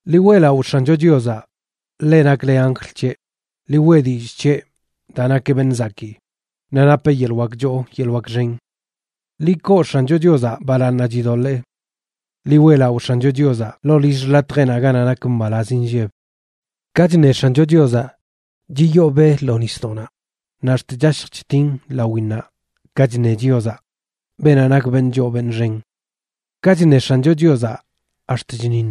Ḻi weꞌlaꞌo X̱ancho Chiozaꞌ, leꞌ nakle anjl c̱heꞌ, ḻi weꞌ dillꞌ c̱heꞌ daa nakeꞌ beṉꞌ zakii, naꞌ napeꞌ yeḻꞌ wak choo yeḻꞌ wak xen. Ḻi koo X̱ancho Chiozaꞌ balaaṉnaꞌ chidoḻee. Ḻi weꞌlaꞌo X̱ancho Chiozaꞌ ḻoo lill xḻatjeꞌnaꞌ ganaꞌ nak mbalaz nlleb. Ka chṉe X̱ancho Chiozaꞌ chiyoo be lo nisdoꞌnaꞌ; naꞌ ax̱t chashj chtin lawinnaꞌ ka chṉe Chiozaꞌ, beenaꞌ nak beṉꞌ choo beṉꞌ xen. Ka chṉe X̱ancho Chiozaꞌ ax̱t chṉiṉ,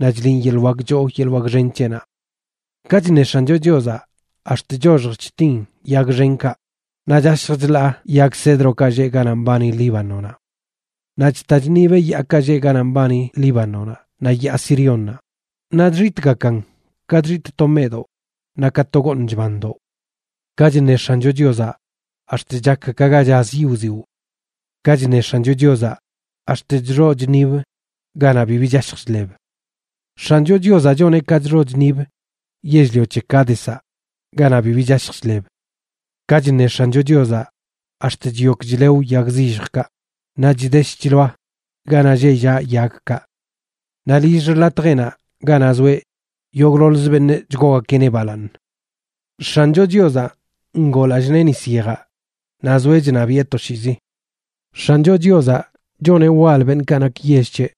naꞌ chliꞌn yeḻꞌ wak choo yeḻꞌ wak xen c̱heꞌnaꞌ. Ka chṉe X̱ancho Chiozaꞌ ax̱t choxj chtin yag xenkaꞌ, naꞌ chashj chlaa yag cedrokaꞌ lleꞌ ganaꞌ mbani Líbanonaꞌ. Naꞌ chta chṉibeꞌ yaakaꞌ lleꞌ ganaꞌ mbani Líbanonaꞌ naꞌ Yaa Siriónnaꞌ, naꞌ chxitꞌgakan ka chxitꞌ to meꞌdoꞌ, naꞌ ka to gooṉ chbandoꞌ. Ka chṉe X̱ancho Chiozaꞌ ax̱t chak ka ga chaz yiꞌ wziwꞌ. Ka chṉe X̱ancho Chiozaꞌ ax̱t chxoꞌ chṉib ganaꞌ bibi chashj chḻeb. X̱ancho Chiozaꞌ choneꞌ ka chxoꞌ chṉib yell-lio c̱he Cádezaꞌ ganaꞌ bibi chashj chḻeb. Ka chṉe X̱ancho Chiozaꞌ ax̱t chyok chlew yag zilljkaꞌ, naꞌ chdesh chḻoa ganaꞌ lleꞌ llaꞌ yagkaꞌ. Naꞌ lill xḻatjeꞌnaꞌ ganaꞌ zoeꞌ, yogꞌḻoḻzə beṉꞌ chgoogakeꞌneꞌ balaaṉ. X̱ancho Chiozaꞌ ngoo lallꞌ nee nis yejaꞌ, naꞌ zoeꞌ chṉabiꞌe toshiizi. X̱ancho Chiozaꞌ choneꞌ wal beṉꞌkaꞌ nak yell c̱heꞌ,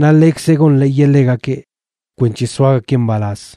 naꞌ ḻekzeꞌ gonḻeeyeꞌ ḻegakeꞌ kwenc̱he soagakeꞌ mbalaz.